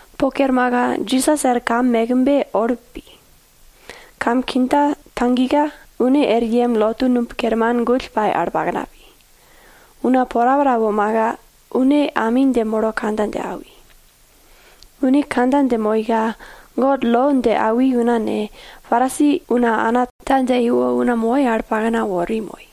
Po kermaka, Jisas er kam mekbe Olip pi. Kam kindja tagika, une er yem lotu numb kerman gull pai al pakna pi. Una porapora womaka, une ami dje molo kandja dje awi. Une kandja dje moika, God lo dje awi una ne, Parisi una ge, ana ta dje iwo una moi al pakna wori moi.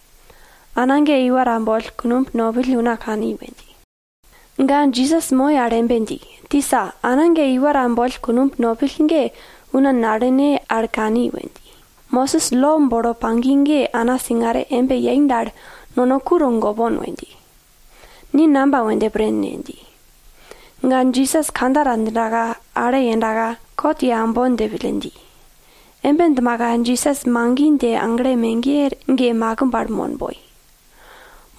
Ana ge iwa ta boll kunumb nopill una kani we dji. Ga Jisas moi al embe dji, tisa, ana ge iwa ta boll kunumb nopill, una nalene al kani we dji. Mosis lo bolo pagi ge ana ta singare embe yei dal, ku togolme dji ba, ni namba we dje pren ne? dji. Ga ge, Jisas kandja ta djinda, ale yendaka, kot ye aumbon dje pille dji. Embe djimaka Jisas magi dje agle megiye pall makimb al mon boi.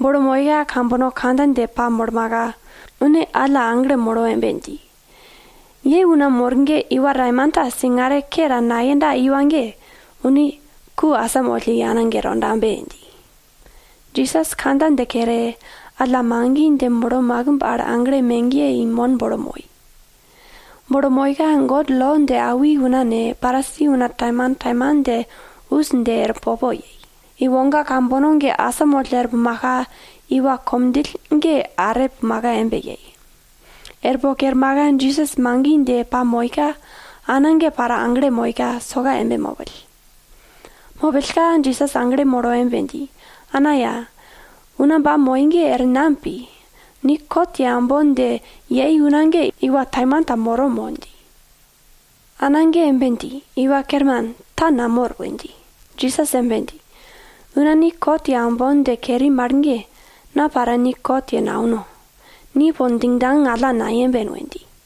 Bolo moika kambono kandja dje pamolmaka, une alla aglo molo embe dji, ye una mor ge, iwa taimanta singare ke ta nayenda iwa ge, une ku asamoll i ana ge tondabe! dji. Jisas kandja dje kere, alla magi dje molo makimb al agle megiye i mon bolo moi. Bolo moika God lo dje awi una ne, Parisi una taimantaiman dje us dje er popo yei. Iwoga kambono ge asamoll er pumaka, iwa komdjill ge are pumaka embe yei. Er po kermaka Jisas magi dje pamoika, ana ge para aglo moika, soka embe mopill. Mopillka Jisas aglo molo embe dji, ana ya, una ba moi ge er nam pi? Ni kot ye aumbon dje yei una ge iwa taimanta moro mo? dji. Ana ge embe dji, Iwa Kerman, ta namor we dji. Jisas embe dji, una ni kot ye aumbon dje keri mal ge, na para ni kot ye naundo. Ni po djingdjang alla nayemben we dji.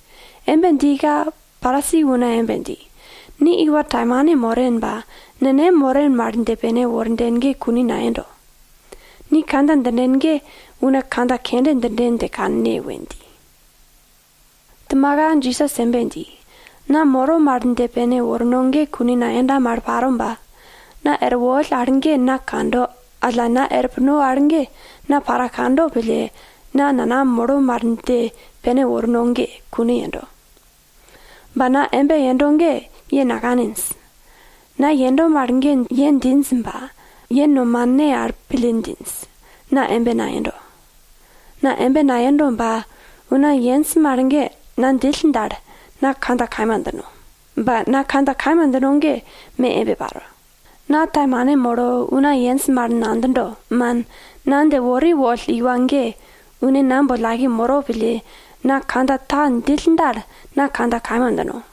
Embe djika, Parisi una embe dji, ni iwa taimane moren ba, nenem moren mal dje pene worden ge kune nayendo. Ni kandja djinden ge una kandja kende djinden dje kanne we dji. Djimaka Jisas embe dji, na moro mal dje pene worno ge kune nayenda mal paro ba, na er woll al ge na kando, alla, na er puno al ge, na para kando pille, na nanam moro mal dje pene worno ge, kune yendo. Ba na embe yendo ge, ye nakaninj. Na yendo mal ge ye djinj ba, ye nomane al pille djinj, na embe nayendo. Na embe nayendo ba, una yenj mal ge na djill dal, na kandja kaima djino. Ba na kandja kaima djindo ge me embe paro. Na taimane molo una yenj mal nadjindo, man, na dje wori woll iwa ge, une na boll aike moro pille, na kandja ta djill dal, na kandja kaima djino.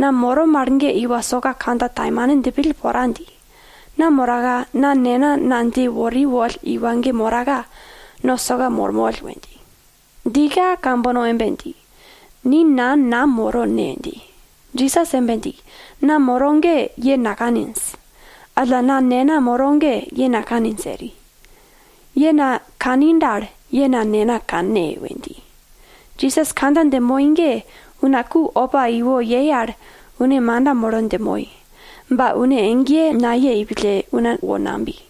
Na moro mal ge iwa soka kandja taimane djipill pora dji. Na moraka, na Nena na dje wori woll iwa ge moraka, no soka mormoll we dji. Djika kambono embe dji, ni nan nam moro ne? dji. Jisas embe dji, na moro ge ye nakaninj, alla na Nena moro ge ye nakaninj eri. Ye na kani dal, ye na Nena kanne we dji. Jisas kandja dje moi ge, una ku opa iwo yei al, une manda molo dje moi. Ba une egeye nayei pille, una wo nabi.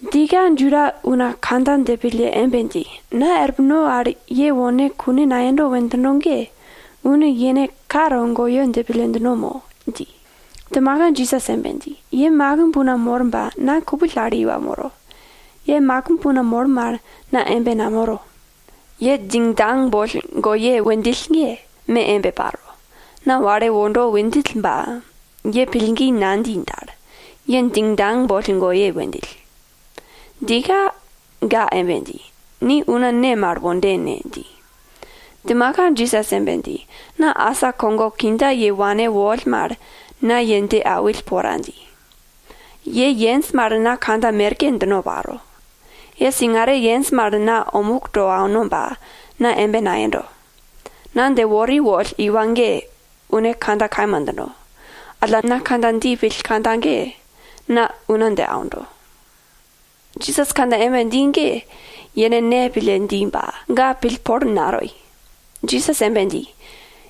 Djika Juda una kandja dje pille embe dji, na er puno al ye wone kune nayendo we djindo ge, une yene ka togoyo dje pille djindo mo? dji. Djimaka Jisas embe dji, ye makimb una mor ba, na kupill al iwa moro. Ye makimb una mor mal, na embe namoro. Ye djingdjang boll goye we djill ge, me embe paro. Na wale wondo we djill ba, ye pillgi nadji dal, ye djingdjang boll goye we djill. Djika ga embe dji, ni una ne mal wonden ne? dji. Djimaka Jisas embe dji, na asa kogo kindja ye wane woll mal, na ye dje awill pora dji. Ye yenj mal na kandja merke djino paro. Ye singare yenj mal na omuk to auno ba, na embe nayendo. Na dje wori woll iwa ge, une kandja kaima djindo. Alla na kandja dji pill kandja ge, na una dje aundo. Jisas kandja embe dji ge, yene Ne pille dji ba, ga pillpol natoi. Jisas embe dji,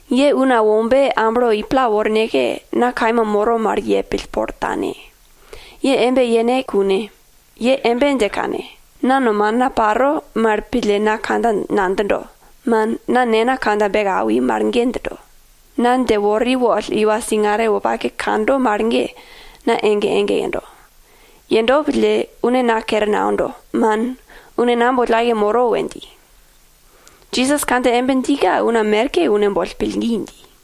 ye Una Wombe amblo i pla worneke, na kaima moro mal ye pillpol tane. Ye embe yene kune, ye embe dje kanne, na nomana paro mal pille na kandja nadjindo, man, na Nena kandja beke awi mal ge djindo. Na dje wori woll iwa singare wopake kando mal ge, na ege ege yendo. Yendo pille, une na kere naundo, man, une na boll aike moro we dji. Jisas kandja embe djika, una merke une boll pillgi dji.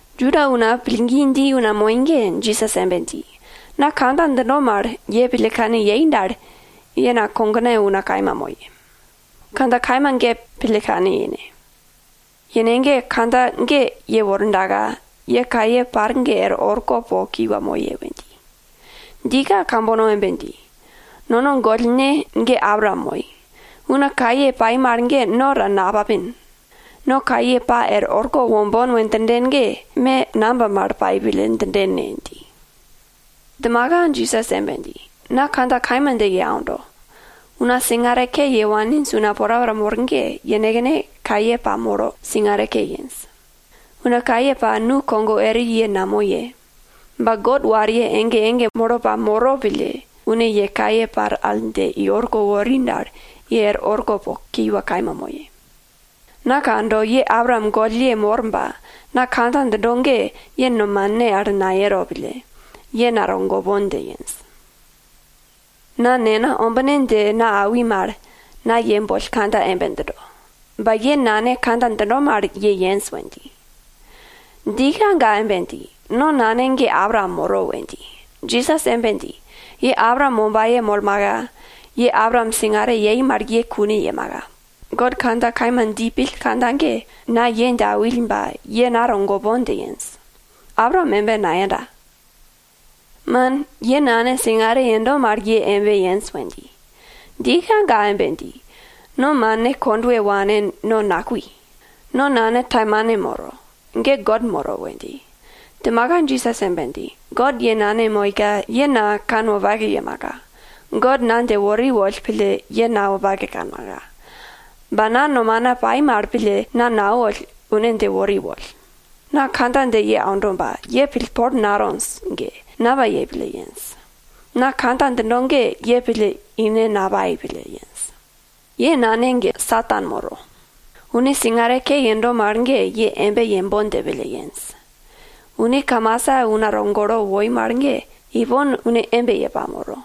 Juda una pillgi dji una moi ge, Jisas embe dji, na kandja djindo mal, ye pille kane yei dal, ye na kogena una kaima moye, kandja kaima ge pille kane yene. Yene ge, kandja ge yewordaka, ye kaye par ge er orko po kiwa moye we dji. Djika kambono embe dji, nono gollne ge Abraam moi. Una nukogo ye kaye pai mal ge no ta napapin. No kaye pa er orko wombon we djinden ge, me namba mal pai pille djinden ne? dji. Djimaka Jisas embe dji, na kandja kaima dje ye aundo, una singare ke ye waninj una porapora mor ge, yenekne kaye pamolo singare ke yenj. Una kaye pa nu kogo eri ye namoye. Ba God wariye ege ege molo pamoro pille, une ye kaye par al dje i orko wori dal, ye er orko po kiwa kaima moye. Na kando, ye Abraam gollye mor ba, na kandja djindo ge ye nomane al nayero pille, ye na togopon dje yenj. Na nena ombine dje na awi mal, na ye boll kandja embe djindo. Ba ye nane kandja djindo mal ye yenj we dji. Djika, ga embe dji, no nane ge Abraam moro we dji. Jisas embe dji, ye Abraam wombaye molmaka, ye Abraam singare yei mal ye kune yemaka. God kandja kaima dji pill kandja ge na ye dje awill ba, ye na togopon dje yenj. Abraam embe nayenda. Man, ye nane singare yendo mal ye embe yenj we dji. Djika ga embe dji, no mane kondwe wane no nakui. No nane taimane moro. Ge God moro we dji. Djimaka Jisas embe dji, God ye nane moika, ye na kanwopake yemaka. God na dje wori woll pille ye na wopake kanmaka. Ba na nomana pai mal pille na nawoll, une dje wori woll. Na kandja dje ye aundo ba, ye pillpol natonj ge, namba yei pille yenj? Na kandja djindo ge ye pille ine napai pille yenj. Ye nane ge Satan moro. Une singare ke yendo mal ge, ye embe yembon dje pille yenj. Une kamasa una togolo woi mal ge, ipon une embe ye pamoro.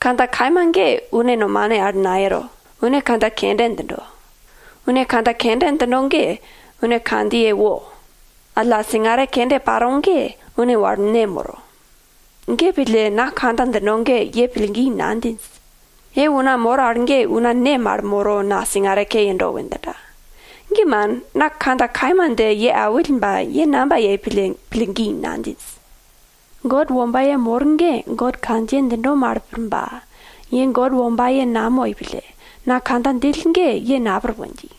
Kandja kaima ge une nomane al nayero, une kandja kende djindo. Une kandja kende djindo ge, une kandjiye wo. Alla singare kende paro ge, une wal ne moro. Ge pille, na kandja djindo ge, ye pillgi nadjinj. Ye una mor al ge una ne mal molo na singare ke yendo we djinda? Ge man, na kandja kaima dje ye awill ba, ye namba yei pille pillgi nadjinj? God wombaye mor ge God kandja djindo mal pir ba, ye God wombaye namoi pille, na kandja djill ge ye napir we dji.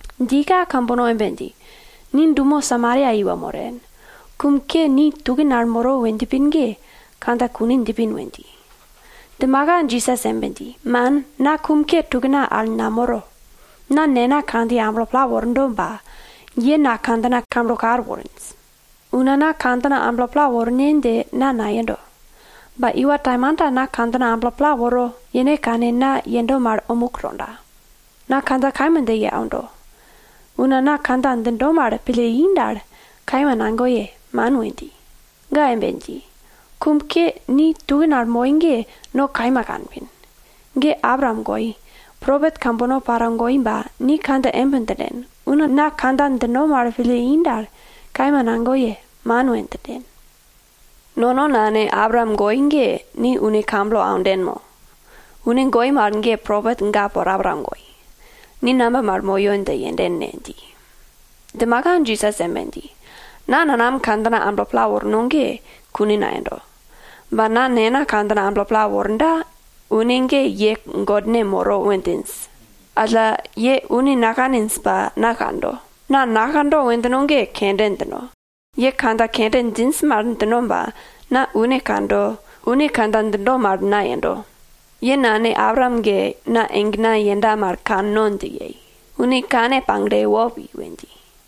Djika kambono embe dji, ni dumo Samaria iwa moren. Kum ke ni tukin al moro we djipin ge, kandja kune djipin we dji. Djimaka Jisas embe dji, man, na kum ke tukna al namoro. Na Nena kandjiye amblo pla wordo ba, ye na kandjina kamblo kal worinj. Una na kandjina amblo pla worne dje na nayendo. Ba Iwa taimanta na kandjina amblo pla woro, yene kane na yendo mal omuk tonda. Na kandja kaima dje ye aundo, una na kandja djindo mal pille i dal, kaima nagoye, man we dji. Ga embe dji, kum ke ni tukin al moi ge no kaima kanpin. Ge Abraam goi, propet kambono para goi ba, ni kandja embe djinden, una na kandja djindo mal pille i dal, kaima nagoye, man we djinden. Nono nane Abraam goi ge, ni une kamblo aunden mo? Une goi mal ge propet ga porapora goi. Ni namba mal moyo dje yenden ne? dji. Djimaka Jisas embe dji, na nanam kandjina amblo pla worno ge kune nayendo. Ba na Nena kandjina amblo pla worda, une ge ye Godne moro we djinj. Alla ye une nakaninj ba, na kando. Na nakando we djino ge, kende djino, ye kandja kende djinj mal djino ba, na une kando, une kandja djindo mal na yendo. Ye nane Abraam ge na egena yenda mal kanno dje yei. Une kane pagle wo pi we dji.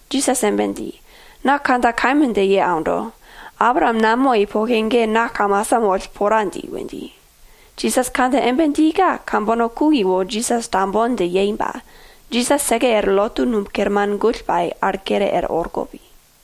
Jisas embe dji, na kandja kaima dje ye aundo, Abraam namoi poke ge na asa moll pora dji we dji. Jisas kandja embe djika, kambono ku iwo Jisas tambon dje yei ba, Jisas seke er lotu numb kerman gull pai al kere er orko pi.